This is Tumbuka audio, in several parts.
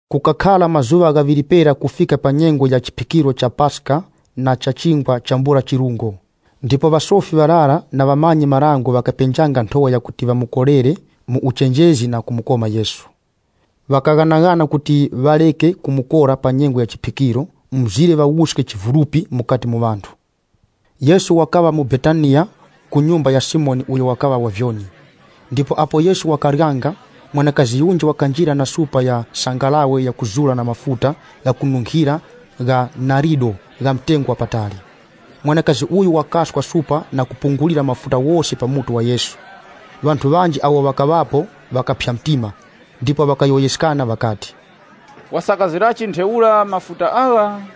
Kukakhara mazuŵa ghaŵiri pera kufika pa nyengo ya chiphikiro cha Paska na cha chingwa chambula chirungo, apo ŵasofi ŵarara na ŵamanyi-marango ŵakapenjanga nthowa yakuti ŵamukorere mu uchenjezi na kumukoma Yesu. Ŵakaghanaghana kuti ŵareke kumukora pa nyengo ya chiphikiro, mzire ŵawuske chivulupi mukati mu ŵanthu. Yesu wakaŵa mu Betaniya ku nyumba ya Simoni uyo wakaŵa wa vyoni. Ndipo apo Yesu wakaryanga, mwanakazi yunji wakanjira na supa ya sangalawe yakuzura na mafuta ghakununkhira gha narido gha mtengo wa patali. Mwanakazi uyu wakaswa supa na kupungulira mafuta ghose pa mutu wa Yesu. Ŵanthu ŵanji awo ŵakaŵapo ŵakaphya mtima, ndipo ŵakayowoyeskana ŵakati, “Wasakazirachi ntheura mafuta agha?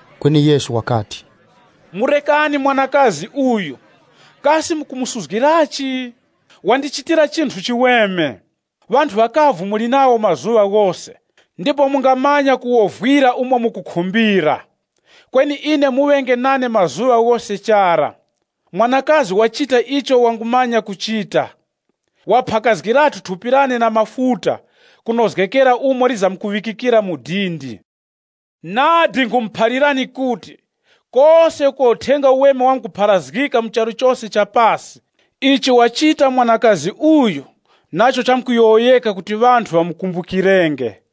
Kweni Yesu wakati, “Murekani mwanakazi uyu, kasi mukumusuzgirachi? Wandichitira chinthu chiweme. Ŵanthu ŵakavu muli nawo mazuŵa ghose, ndipo mungamanya kuwovwira umo mukukhumbira. Kweni ine muŵenge nane mazuŵa ghose chara. Mwanakazi wachita icho wangumanya kuchita. Waphakazgirathu thupi lane na mafuta, kunozgekera umo lizamuŵikikira mu dindi. Nadi nkhumuphalirani kuti, kose uko Uthenga Uweme wamkupharazgika mu charu chose cha pasi, ichi wachita mwanakazi uyu nacho chamkuyowoyeka kuti ŵanthu ŵamukumbukirenge chakhe.”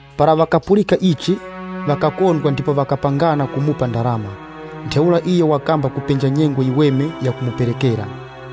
Para ŵakapulika ichi, ŵakakondwa ndipo ŵakapangana kumupa ndarama. Ntheura iyo wakamba kupenja nyengo yiweme yakumuperekera.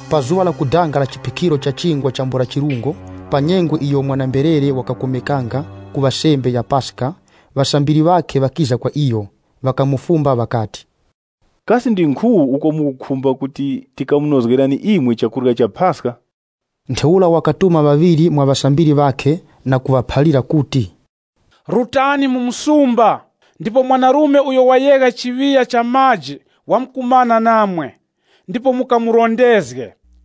Pa zuŵa lakudanga la chiphikiro cha Chingwa chambula chirungo, pa nyengo iyo mwana-mberere wakakomekanga kuŵa sembe ya Paska, ŵasambiri ŵakhe ŵakiza kwa iyo. Ŵakamufumba ŵakati, “Kasi ndi nkhu uko mukukhumba kuti tikamunozgerani imwe chakurya cha Paska?” Ntheura wakatuma ŵaŵiri mwa ŵasambiri ŵakhe na kuŵaphalira kuti, “Rutani mu msumba, ndipo mwanarume uyo wayegha chiŵiya cha maji wamkumana namwe, ndipo mukamurondezge.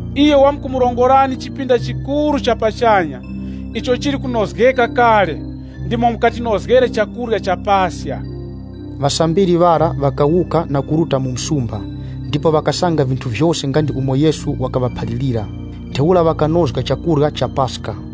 Iyo wamkumurongorani chipinda chikuru cha pachanya, icho chili kunozgeka kale. Mwenemura ndimo mukatinozgere chakurya cha Paska.” Ŵasambiri ŵara ŵakawuka na kuruta mu msumba, ndipo ŵakasanga vinthu vyose nga ndi umo Yesu wakaŵaphalirira. Ntheura ŵakanozga chakurya cha Paska.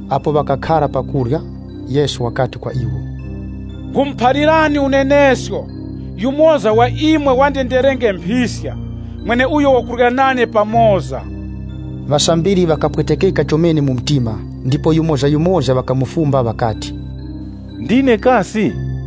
Apo ŵakakhara pa kurya, Yesu wakati kwa iwo, “Nkhumuphalirani unenesko, yumoza wa imwe wandenderenge mphiska, mweneuyo wakurya nane pamoza.” Ŵasambiri ŵakapwetekeka chomene mu mtima, ndipo yumozayumoza ŵakamufumba ŵakati, “Kasi ndine?”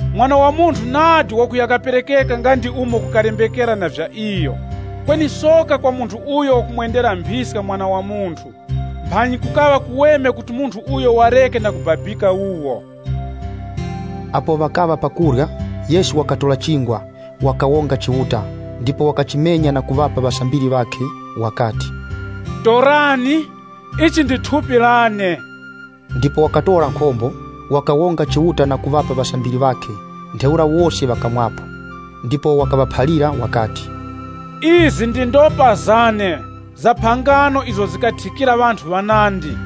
Mwana wa Munthu nadi wakuya kaperekeka nga ndi umo kukalembekera na vya iyo, kweni soka kwa munthu uyo wakumwendera mphiska Mwana wa Munthu. Mphanyi kukaŵa kuweme kuti munthu uyo wareke na kubabika wuwo.” Apo ŵakaŵa pa kurya, Yesu wakatora chingwa, wakawonga Chiuta, ndipo wakachimenya na kuŵapa ŵasambiri ŵakhe wakati, “Torani, ili ndi thupi lane.” Ndipo wakatora nkhombo, wakawonga Chiuta na kuŵapa ŵasambiri wakhe, ntheura wose ŵakamwapo. Ndipo wakaŵaphalira wakati, “Izi ndi ndopa zane za phangano izo zathikira ŵanthu ŵanandi.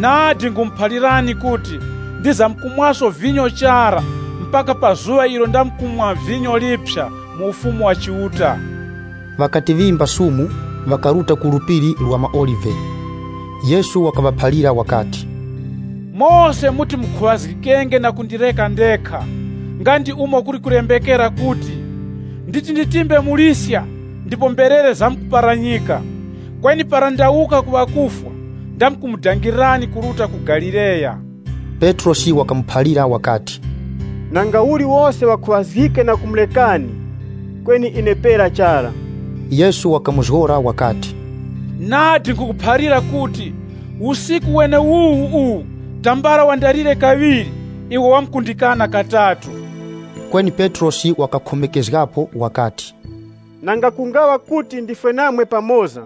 Nadi nkhumuphalirani kuti, ndizamkumwaso vinyo chara mpaka pa zuŵa ilo ndamkumwa vinyo liphya mu Ufumu wa Chiuta.” Ŵakati ŵimba sumu, ŵakaruta ku Phiri la maOlive. Yesu wakaŵaphalira wakati, “Mose muti mukhuŵazgikenge na kundireka ndekha, nga ndi umo kuli kulembekera kuti, ‘Nditi nditimbe muliska, ndipo mberere zamkumbininika.’ Kweni para ndawuka ku ŵakufwa, ndamkumundangirirani kuruta ku Galileya.” Petrosi wakamuphalira wakati, “Nangauli wose ŵakhuŵazgike na kumurekani, kweni ine pera chara.” Yesu wakamuzgora wakati, “Nadi nkhukuphalira kuti, usiku weneuwu uwu, tambala wandalire kaŵiri, iwe wamkundikana katatu.” Kweni Petrosi wakakhomekezgapo wakati, “Nanga kungaŵa kuti ndifwe namwe pamoza,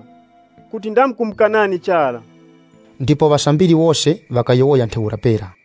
kuti ndamkumukanani chara.” Ndipo ŵasambiri wose ŵakayowoya ntheura pera.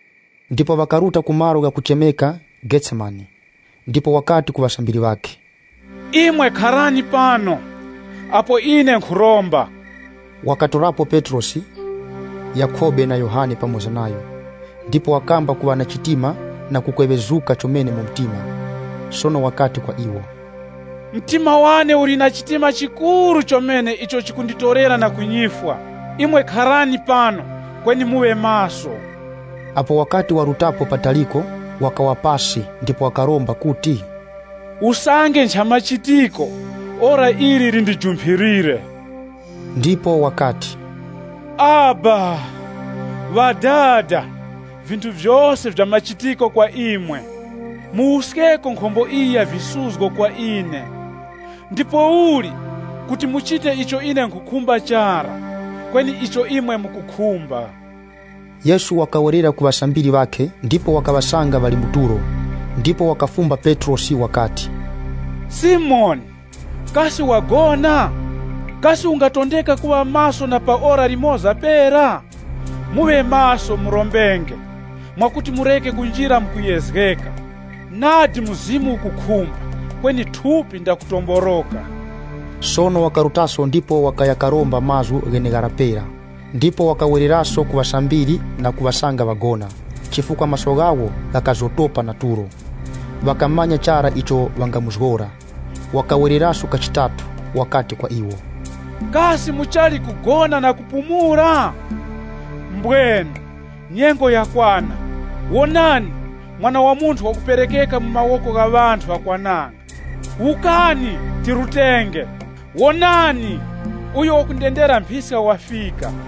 Ndipo ŵakaruta ku malo ghakuchemeka Getsemane. Ndipo wakati ku ŵasambiri ŵakhe, “Imwe kharani pano, apo ine nkhuromba.” Wakatorapo Petrosi, Yakhobe na Yohane pamoza nayo, ndipo wakamba kuŵa na chitima na kukweŵezuka chomene mu mtima. Sono wakati kwa iwo, “Mtima wane uli na chitima chikuru chomene icho chikunditorera na ku nyifwa. Imwe kharani pano, kweni muŵe maso.” Apo wakati waruta pataliko, wakawa pasi ndipo wakaromba kuti, “Usange nchamachitiko, ora ili lindijumphirire.” Ndipo wakati, “Abba Ŵadada, vinthu vyose nvyamachitiko kwa imwe. Muwuskeko nkhombo iyi ya visuzgo kwa ine. Ndipouli, kuti muchite icho ine nkhukhumba chara, kweni icho imwe mukukhumba.” Yesu wakawerera ku ŵasambiri ŵakhe, ndipo wakaŵasanga ŵali mu tulo. Ndipo wakafumba Petrosi wakati, “Simoni, kasi wagona? Kasi ungatondeka kuŵa maso na pa ora limoza pera? Muŵe maso murombenge, mwakuti mureke kunjira mu kuyezgeka. Nadi mzimu ukukhumba kweni thupi ndakutomboroka.” Sono wakarutaso ndipo wakaya karomba mazgu gheneghara pera. Ndipo wakawereraso ku ŵasambiri na kuŵasanga ŵagona, chifukwa maso ghawo ghakazotopa na tulo. Ŵakamanya chara icho ŵangamuzgora. Wakawereraso kachitatu, wakati kwa iwo, “Kasi muchali kugona na kupumula? Mbwenu! Nyengo yakwana. Wonani, Mwana wa Munthu wakuperekeka mu mawoko gha ŵanthu ŵakwananga. Wukani. Tirutenge! Wonani uyo wakundendera mphiska wafika.”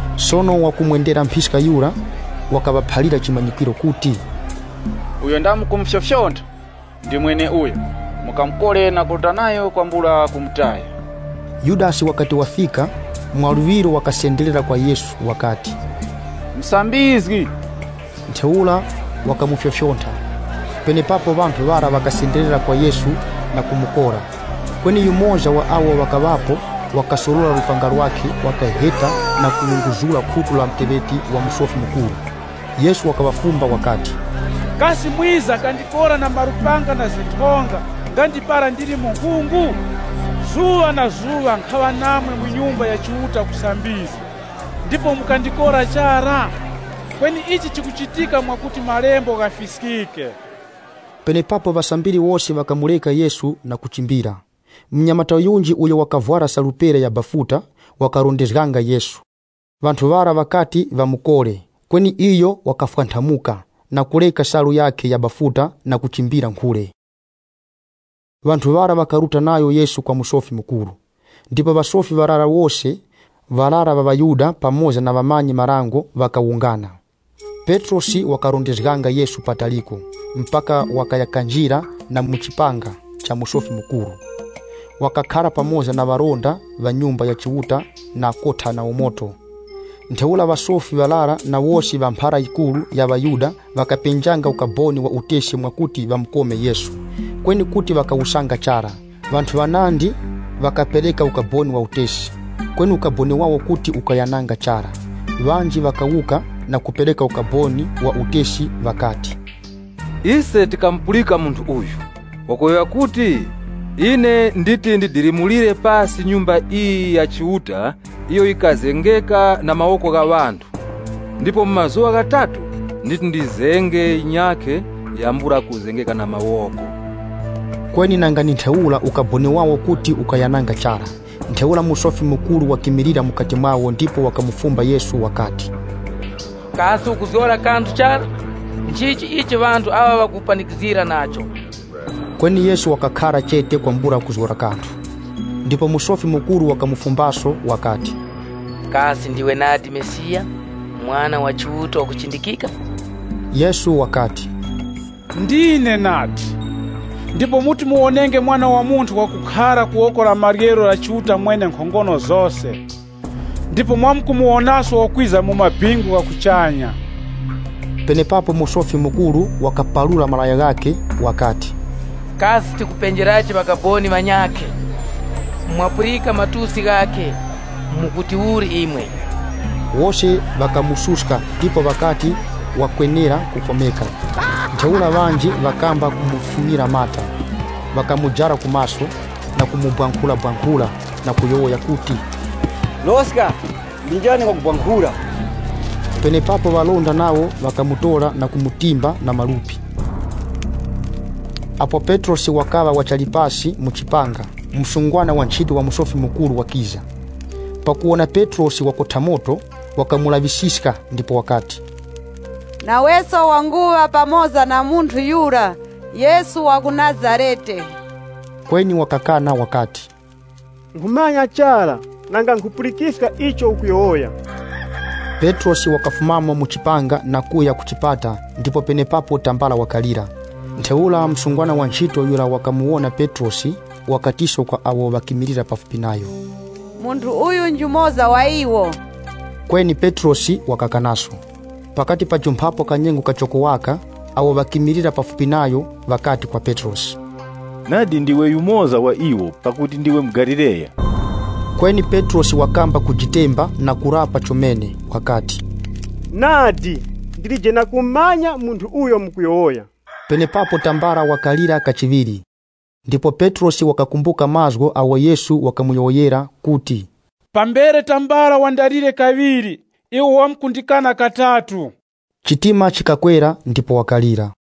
Sono wakumwendera mphiska yura wakaŵaphalira chimanyikwiro kuti, “Uyo ndamkumufyofyontha ndi mweneuyo, mukamukore na kuruta nayo kwambula kumutaya.” Yudasi wakati wafika, mwaluŵiro wakasenderera kwa Yesu wakati, “Musambizgi!” Ntheura wakamufyofyontha. Penepapo ŵanthu ŵara ŵakasenderera kwa Yesu na kumukora. Kweni yumoza wa awo ŵakaŵapo, wakasorora lupanga lwakhe wakaheta na kuwunguzura khutu la muteŵeti wa Musofi Mukuru. Yesu wakaŵafumba wakati, “Kasi mwiza kandikora na malupanga na zinthonga nga ndi para ndili munkhungu? Zuŵa na zuŵa nkhaŵa namwe mu Nyumba ya Chiuta kusambizga, ndipo mukandikora chara? Kweni ichi chikuchitika mwakuti malembo ghafiskike.” Penepapo ŵasambiri wose ŵakamureka Yesu na kuchimbira. Munyamata yunji, uyo wakavwara salu pera ya bafuta, wakarondezganga Yesu. Ŵanthu ŵara ŵakati ŵamukore, kweni iyo wakafwanthamuka, na kureka salu yakhe ya bafuta na kuchimbira nkhule. Ŵanthu ŵara ŵakaruta nayo Yesu kwa Musofi Mukuru. Ndipo ŵasofi ŵarara wose, ŵarara ŵa ŵaYuda pamoza na ŵamanyi-marango ŵakawungana. Petrosi wakarondezganga Yesu pataliko, mpaka wakaya kanjira na mu chipanga cha Musofi Mukuru. Wakakhara pamoza na ŵalinda ŵa Nyumba ya Chiuta na kotha nawo moto. Ntheura ŵasofi ŵarara na wose ŵa mphara yikuru ya ŵaYuda ŵakapenjanga ukaboni wa utesi mwakuti ŵamukome Yesu, kweni kuti ŵakawusanga chara. Ŵanthu ŵanandi wakapereka ukaboni wa utesi, kweni ukaboni wawo kuti ukayananga chara. Ŵanji ŵakawuka na kupereka ukaboni wa utesi ŵakati, “Ise tikamupulika munthu uyu wakuti, ‘Ine nditi ndidilimulire pasi Nyumba iyi ya Chiuta iyo yikazengeka na mawoko gha ŵanthu, ndipo mu mazuŵa ghatatu nditi ndizenge yinyakhe yambula kuzengeka na mawoko.’” Kweni nanga ndi ntheura ukaboni wawo kuti ukayananga chara. Ntheura Musofi Mukuru wakimilira mukati mwawo ndipo wakamufumba Yesu wakati, “Kasi ukuzgora kanthu chara? Nchichi ichi ŵanthu aŵa ŵakukupanikizgira nacho?” Kweni Yesu wakakhara chete kwambula kuzgora kanthu. Ndipo Musofi Mukuru wakamufumbaso wakati, “Kasi ndiwe nadi Mesiya, Mwana wa Chiuta wakuchindikika?” Yesu wakati, “Ndine nadi, ndipo muti muwonenge Mwana wa Munthu wakhara ku woko la maryero la Chiuta Mwenenkhongono zose. Ndipo mwamkumuwonaso wakwiza mu maŵingu gha kuchanya.” Penepapo Musofi Mukuru wakaparura malaya ghakhe wakati, “Kasi tikupenjerachi ŵakaboni ŵanyakhe? Mwapulika matusi ghakhe. Mukuti uli imwe?” Wose ŵakamususka ndipo ŵakati wakwenera kukomeka. Ntheura ŵanji ŵakamba kumufunyira mata, ŵakamujara ku maso, na kumubwankhurabwankhura na kuyowoya kuti, “Loska ndi njani wakubwankhura!” Penepapo ŵalinda nawo ŵakamutora na kumutimba na malupi. Apo Petrosi wakaŵa wachali pasi mu chipanga, msungwana wanchito wa Musofi Mukuru wakiza. Pakuwona Petrosi wakotha moto, wakamulaŵisiska ndipo wakati, “Naweso wanguŵa pamoza na munthu yura Yesu wa ku Nazarete.” Kweni wakakana wakati, “Nkhumanya chara nanga nkhupulikiska icho ukuyowoya.” Petrosi wakafumamo mu chipanga na kuya ku chipata ndipo penepapo tambala wakalira. Ntheura msungwana wanchito yura wakamuwona Petrosi, wakatiso kwa awo ŵakimilira pafupi nayo, “Munthu uyu njumoza wa iwo.” Kweni Petrosi wakakanaso. Pakati pajumphapo ka nyengo kachoko waka, awo ŵakimilira pafupi nayo ŵakati kwa Petrosi, “Nadi ndiwe yumoza wa iwo, pakuti ndiwe muGalileya.” Kweni Petrosi wakamba kujitemba na kurapa chomene wakati, “Nadi ndilije na kumumanya munthu uyo mukuyowoya.” Penepapo tambala wakalira kachiŵiri, ndipo Petrosi wakakumbuka mazgu agho Yesu wakamuyowoyera kuti, “Pambere tambala wandalire kaŵiri, iwe wamkundikana katatu.” Chitima chikakwera ndipo wakalira.